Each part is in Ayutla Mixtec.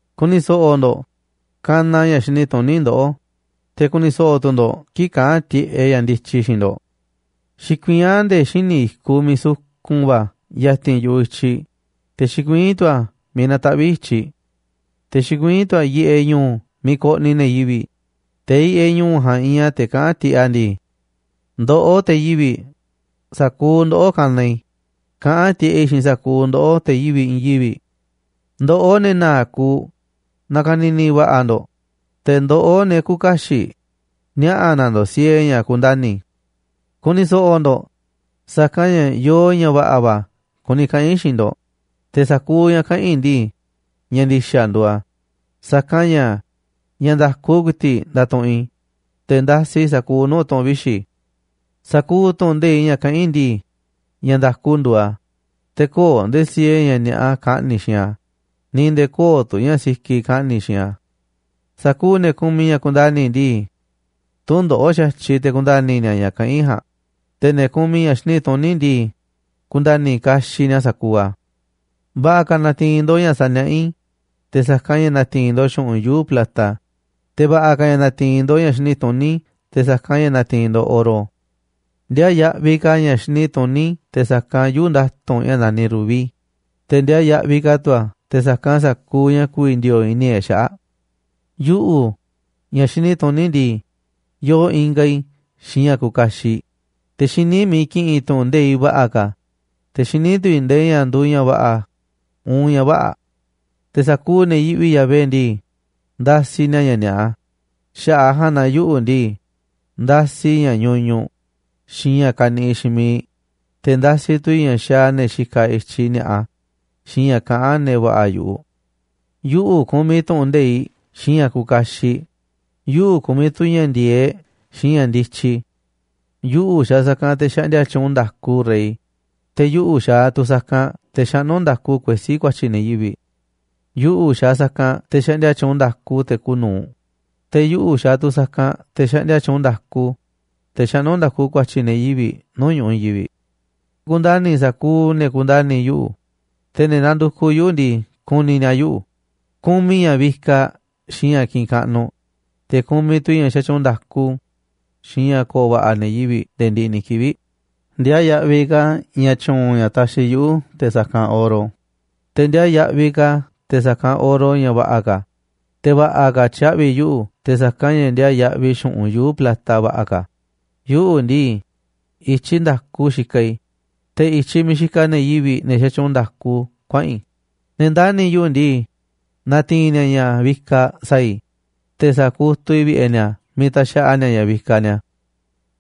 Ku̱ni̱ so̱ꞌo̱ ndo̱ꞌ, kanaꞌ ña̱ xini tuní ndoꞌó, te̱ ku̱ni̱ so̱ꞌo̱ tu̱ ndo̱ꞌ kii̱ꞌ kaꞌán tiꞌeꞌ ña̱ ndityi xiinꞌ ndo̱ꞌ. Xikuiín a̱ nde̱e̱ xíniꞌ i̱kuꞌ miiꞌ sukun va̱ ya̱ti̱n yu̱ꞌuꞌ i̱tyiꞌ, te̱ xikuiín tu̱ a̱ miiꞌ nataꞌvíꞌ i̱tyiꞌ. Te̱ xikuiín tu̱ a̱ yiꞌeꞌ ñu̱u̱ miiꞌ koꞌniꞌ ne̱ yivi̱ꞌ, te̱ yiꞌeꞌ ñu̱u̱ ja̱a̱nꞌ iinꞌ a̱ te̱ kaꞌán tiꞌeꞌ a̱ ndii: “Ndoꞌó te̱ yivi̱ꞌ, sa̱kuuꞌ ndoꞌó kanaꞌ i̱, kaꞌán tiꞌeꞌ i̱ xiinꞌ sa̱kuuꞌ ndoꞌó, te̱ yivi̱ꞌ i̱i̱n yivi̱ꞌ. Ndoꞌó, ne̱ na̱a̱ꞌ kuuꞌ, na̱ka̱ni̱ni̱ va̱ꞌa̱ ndo̱ꞌ, te̱ ndoꞌó, ne̱ küuꞌ kaxiꞌ, niaꞌa̱ na̱ ndo̱ꞌ siee ña̱ kundani̱. Ku̱ni̱ so̱ꞌo̱ ndo̱ꞌ, sa̱kanꞌ ña̱ yoo ña̱ va̱ꞌa̱ va̱ kuni kaꞌa̱n i̱ xiinꞌ ndo̱ꞌ, te̱ sa̱kuuꞌ ña̱ kaꞌa̱n i̱ ndii, ña̱ ndi̱xa̱ nduuꞌ a̱, sa̱kanꞌ ña̱, ña̱ nda̱ku ku̱i̱ti̱ꞌ ndatuꞌunꞌ i̱, te̱ ndasiꞌ i̱ sa̱kuuꞌ nuu̱ꞌ tu̱ꞌu̱n vixi̱. Sa̱kuuꞌ tu̱ꞌu̱n nde̱iꞌ ña̱ kaꞌán i̱ ndii, ña̱ nda̱ku nduuꞌ a̱, te̱ köo̱ꞌ nde̱e̱ siee ña̱ ni̱a̱ꞌa kaꞌni̱ xiinꞌ a̱, ni̱ nde̱e̱ köo̱ꞌ tu̱ ña̱ sikiꞌ kaꞌni̱ xiinꞌ a̱. Sa̱kuuꞌ ne̱ kumiꞌ ña̱ kundani̱ ndii, tü̱ndoꞌo̱ꞌ xa̱tyiꞌ te̱ ku̱nda̱ni̱ ni̱a̱ ña̱ kaꞌán i̱ ja̱a̱nꞌ, te̱ ne̱ kumiꞌ ña̱ xini tuní ndii, ku̱nda̱ni̱ kaxiꞌ ni̱a̱ sa̱kuuꞌ a̱. Va̱ꞌa̱ ka̱ na̱ti̱i̱n ndo̱ꞌ ña̱ saniaꞌá i̱, te̱ sa̱kanꞌ ña̱ na̱ti̱i̱n ndo̱ꞌ xu̱ꞌunꞌ yuu̱ꞌ plata, te̱ va̱ꞌa̱ ka̱ ña̱ na̱ti̱i̱n ndo̱ꞌ ña̱ xini tuní te̱ sa̱kanꞌ ña̱ na̱ti̱i̱n ndo̱ꞌ oro. Ndiaa yaꞌviꞌ ka̱ ña̱ xini tuní te̱ sa̱kanꞌ yuu̱ꞌ nda̱tu̱nꞌ ña̱ naniꞌ rubí, te̱ ndiaa yaꞌviꞌ ka̱ tu̱ a̱ te̱ sa̱kanꞌ sa̱kuuꞌ ña̱ ku̱vi̱ ndi̱o̱o̱ꞌ i̱ni̱ e̱ꞌ xaꞌa̱ꞌ. ’Yuꞌu̱, ña̱ xini tuní ndii, yoo ingaꞌ i̱ xiinꞌ ña̱ kuuꞌ kaxiꞌ, te̱ xiní i̱ miiꞌ ki̱ꞌi̱n i̱ tu̱ꞌu̱n nde̱iꞌ va̱ꞌa̱ ka̱, te̱ xiní tu̱ i̱ nde̱e̱ ña̱ nduuꞌ ña̱ va̱ꞌa̱ uun ña̱ vä̱ꞌa̱. Te̱ sa̱kuuꞌ ne̱ yiꞌvi Yahvé ndii, ndasiꞌ ni̱a̱ ña̱ ni̱a̱ꞌa, xaꞌa̱ꞌ a̱ ja̱a̱nꞌ na yuꞌu̱ ndii, ndasiꞌ i̱ ña̱ ñuñuꞌ xiinꞌ ña̱ kaniꞌiꞌ xiinꞌ miiꞌ, te̱ ndasiꞌ tu̱ i̱ ña̱ xaaꞌ ne̱ xikaꞌ i̱tyiꞌ ni̱a̱ꞌa, xiinꞌ ña̱ kaꞌán ne̱ va̱ꞌa̱ yu̱ꞌuꞌ. Yuꞌu̱ kumiꞌ tu̱ꞌu̱n nde̱iꞌ xiinꞌ ña̱ kuuꞌ kaxiꞌ, yuꞌu̱ kumiꞌ tu̱ ña̱ ndi̱e̱eꞌ xiinꞌ ña̱ ndityi. Yuꞌu̱ xaaꞌ sa̱kanꞌ te̱ xaꞌndia tyuunꞌ nda̱ku rey, te̱ yuꞌu̱ xaaꞌ tu̱ sa̱kanꞌ te̱ xaꞌnú nda̱ku kuesí ku̱a̱tyi̱ ne̱ yivi̱ꞌ. Yuꞌu̱ xaaꞌ sa̱kanꞌ te̱ xaꞌndia tyuunꞌ nda̱ku te̱ kuuꞌ nu̱uꞌ, te̱ yuꞌu̱ xaaꞌ tu̱ sa̱kanꞌ te̱ xaꞌndia tyuunꞌ nda̱ku, te̱ xaꞌnú nda̱ku ku̱a̱tyi̱ ne̱ yivi̱ꞌ nuu̱ꞌ ñu̱ꞌuꞌ i̱i̱n yivi̱ꞌ. Ku̱ndani̱ i̱ sa̱kuuꞌ ne̱ kundani̱ yuꞌu̱, te̱ ne̱ nandukuꞌ yuꞌu̱ ndii, ku̱ni̱ ni̱a̱ yuꞌu̱. Kumiꞌ i̱ ña̱ vikaꞌ xiinꞌ ña̱ kiꞌinꞌ kaꞌnuꞌ, te̱ kumiꞌ tu̱ i̱ ña̱ xatyuunꞌ nda̱ku xiinꞌ ña̱ ko̱o̱ va̱ꞌa̱ ne̱ yivi̱ꞌ nde̱e̱ ndiꞌiꞌ ni̱ kivi̱ꞌ. Ndiaa yaꞌviꞌ ka̱ ña̱ tyu̱u̱n ña̱ taxiꞌ yuꞌu̱ te̱ sa̱kanꞌ oro, te̱ ndiaa yaꞌviꞌ ka̱ a̱ te̱ sa̱kanꞌ oro ña̱ va̱ꞌa̱ ka̱, te̱ va̱ꞌa̱ ka̱ tyaꞌvi̱ yuꞌu̱ te̱ sa̱kanꞌ ña̱ ndiaa yaꞌviꞌ xu̱ꞌunꞌ yuu̱ꞌ plata va̱ꞌa̱ ka̱. Yuꞌu̱ ndii, i̱tyiꞌ nda̱ku xikaꞌ i̱, te̱ i̱tyiꞌ miiꞌ xikaꞌ ne̱ yivi̱ꞌ, ne̱ xatyuunꞌ nda̱ku, kuaꞌa̱n i̱. Ne̱ ndani̱ yuꞌu̱ ndii, na̱ti̱i̱n ni̱a̱ ña̱ vikaꞌ sa̱a̱ i̱, te̱ sa̱kutuꞌ i̱ vi̱ꞌe̱ ni̱a̱ miiꞌ taxaꞌa ni̱a̱ ña̱ vikaꞌ ni̱a̱.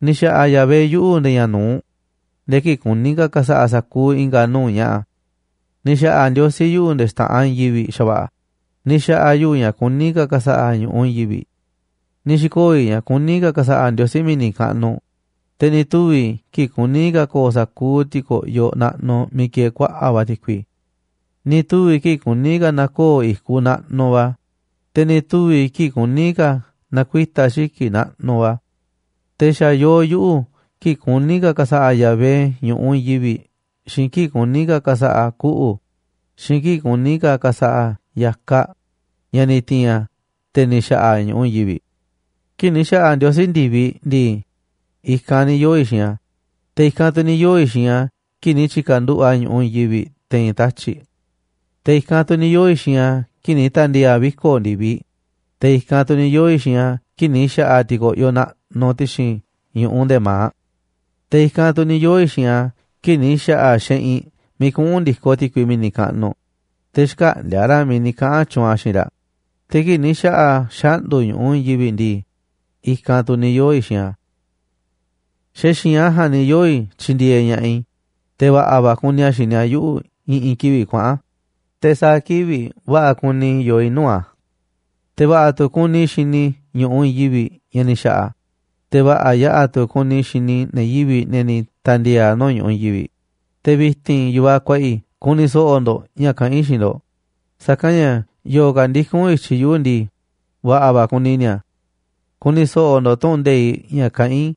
’Ni̱ xa̱ꞌa̱ Yahvé yuꞌu̱ nde̱e̱ ña̱ nu̱uꞌ, nde̱e̱ kii̱ꞌ kuní ka̱ ka̱sa̱ꞌa̱ a̱ sa̱kuuꞌ i̱nga̱ nuu̱ꞌ ña̱ꞌa̱. Ni̱ xa̱ꞌa̱ Ndiosí yuꞌu̱ nde̱e̱ xta̱ꞌanꞌ i̱i̱n yivi̱ꞌ xa̱va̱ꞌa̱, ni̱ xa̱ꞌa̱ a̱ yuꞌu̱ ña̱ kuní ka̱ ka̱sa̱ꞌa̱ a̱ ñu̱ꞌuꞌ i̱i̱n yivi̱ꞌ. Ni̱ xi̱koo̱ i̱ ña̱ kuní ka̱ ka̱sa̱ꞌa̱ Ndiosí mi̱ni̱ kaꞌnuꞌ, te̱ ni̱ tuvi̱ i̱ kii̱ꞌ kuní ka̱ ko̱o̱ sa̱kuuꞌ ti̱ko̱ꞌyoꞌ naꞌnuꞌ miiꞌ kieeꞌ kuaꞌa̱ꞌ va̱ ti̱kui. Ni̱ tuvi̱ i̱ kii̱ꞌ kuní ka̱ na̱koo̱ i̱kuꞌ naꞌnuꞌ va̱, te̱ ni̱ tuvi̱ i̱ kii̱ꞌ kuní ka̱ na̱kuita̱ xiki̱ꞌ naꞌnuꞌ va̱. Te̱ xa̱ yoo yuꞌu̱ kii̱ꞌ kuní ka̱ ka̱sa̱ꞌa̱ Yahvé ñu̱ꞌuꞌ i̱i̱n yivi̱ꞌ xiinꞌ kii̱ꞌ kuní ka̱ ka̱sa̱ꞌa̱ a̱ kuꞌu̱, xiinꞌ kii̱ꞌ kuní ka̱ ka̱sa̱ꞌa̱ a̱ ya̱kaꞌ ña̱ ni̱ ti̱i̱n a̱, te̱ ni̱ xa̱ꞌa̱ a̱ ñu̱ꞌuꞌ i̱i̱n yivi̱ꞌ. Kii̱ꞌ ni̱ xa̱ꞌa̱ Ndiosí ndi̱viꞌ ndii, i̱kanꞌ ni̱ yoo̱ i̱ xiinꞌ a̱, te̱ i̱kanꞌ tu̱ ni̱ yoo̱ i̱ xiinꞌ a̱ kii̱ꞌ ni̱ tyi̱ka̱nduꞌu̱ꞌ a̱ ñu̱ꞌuꞌ i̱i̱n yivi̱ꞌ te̱i̱n tatyi̱ꞌ. Te̱ i̱kanꞌ tu̱ ni̱ yoo̱ i̱ xiinꞌ a̱ kii̱ꞌ ni̱ ta̱ndi̱e̱e̱ a̱ viko̱ꞌ ndi̱viꞌ, te̱ i̱kanꞌ tu̱ ni̱ yoo̱ i̱ xiinꞌ a̱ kii̱ꞌ ni̱ xa̱ꞌa̱ a̱ ti̱ko̱ꞌyoꞌ naꞌnuꞌ ti̱xi̱n ñu̱ꞌuꞌ nde̱e̱ ma̱aꞌ. Te̱ i̱kanꞌ tu̱ ni̱ yoo̱ xiinꞌ a̱ kii̱ꞌ ni̱ xa̱ꞌa̱ a̱ xeꞌinꞌ miiꞌ kuꞌu̱n ndi̱koꞌ ti̱kui mi̱ni̱ kaꞌnuꞌ, te̱ xkäꞌndi̱a̱ raꞌ miiꞌ ni̱ kaꞌa̱n tyuunꞌ a̱ xiinꞌ raꞌ. Te̱ kii̱ꞌ ni̱ xa̱ꞌa̱ a̱ xaꞌndu̱ ñu̱ꞌuꞌ i̱i̱n yivi̱ꞌ ndii, i̱kanꞌ tu̱ ni̱ yoo̱ i̱ xiinꞌ a̱, xa̱ xi̱i̱nꞌ a̱ ja̱a̱nꞌ ni̱ yoo̱ i̱ tyindieeꞌ ña̱ꞌaꞌ i̱, te̱ va̱ꞌa̱ va̱ kuni a̱ xini a̱ yuꞌu̱ i̱ꞌi̱n kivi̱ꞌ kuaꞌa̱n, te̱ sa̱a̱ kivi̱ꞌ va̱ꞌa̱ kuni i̱ yoo i̱ nuu̱ꞌ a̱. Te̱ va̱ꞌa̱ tu̱ kuni i̱ xini i̱ ñu̱ꞌuꞌ i̱i̱n yivi̱ꞌ ña̱ ni̱ xa̱ꞌa̱ a̱, te̱ va̱ꞌa̱ yaꞌa̱ tu̱ kuni i̱ xini i̱ ne̱ yivi̱ꞌ, ne̱ ni̱ ta̱ndi̱e̱e̱ a̱ nuu̱ꞌ ñu̱ꞌuꞌ i̱i̱n yivi̱ꞌ. ’Te̱ vi̱ti̱n, yu̱vaꞌ kuaꞌa i̱, ku̱ni̱ so̱ꞌo̱ ndo̱ꞌ ña̱ kaꞌán i̱ xiinꞌ ndo̱ꞌ, sa̱kanꞌ ña̱ yo̱o̱ ka̱ ndikún i̱tyiꞌ yuꞌu̱ ndii, va̱ꞌa̱ va̱ kuni ni̱a̱. Ku̱ni̱ so̱ꞌo̱ ndo̱ꞌ tu̱ꞌu̱n nde̱iꞌ ña̱ kaꞌán i̱,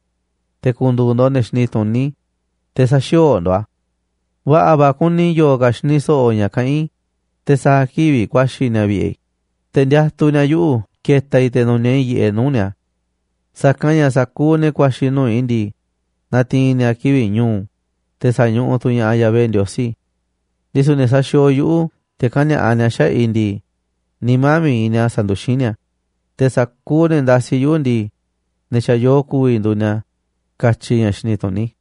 te̱ ku̱ndu̱u̱ ndo̱ꞌ ne̱ xini tuní, te̱ sä̱xi̱o̱o̱ ndo̱ꞌ a̱. Va̱ꞌa̱ va̱ kuni yo̱o̱ ka̱ xini so̱ꞌo̱ ña̱ kaꞌán i̱, te̱ sa̱a̱ kivi̱ꞌ ku̱a̱xi̱ ni̱a̱ vi̱ꞌe̱ i̱, te̱ ndiatuꞌ ni̱a̱ yuꞌu̱ ke̱ta̱ i̱ te̱ nu̱niaꞌ i̱ yiꞌeꞌ nuu̱ꞌ ni̱a̱. Sa̱kanꞌ ña̱ sa̱kuuꞌ ne̱ ku̱a̱xi̱ nuu̱ꞌ i̱ ndii, na̱ti̱i̱n ni̱a̱ kivi̱ꞌ ñu̱u̱, te̱ sa̱ñuꞌuꞌ tu̱ ña̱ꞌaꞌ Yahvé Ndiosí. Ndisu̱ ne̱ saxiooꞌ yuꞌu̱ te̱ kani̱a̱ꞌa ni̱a̱ xaꞌa̱ꞌ i̱ ndii, nimá mi̱iꞌ ni̱a̱ sanduxín ni̱a̱, te̱ sa̱kuuꞌ ne̱ ndasiꞌ yuꞌu̱ ndii, ne̱ xa̱ yoo ku̱vi̱ nduuꞌ ni̱a̱”, katyi ña̱ xini tuní.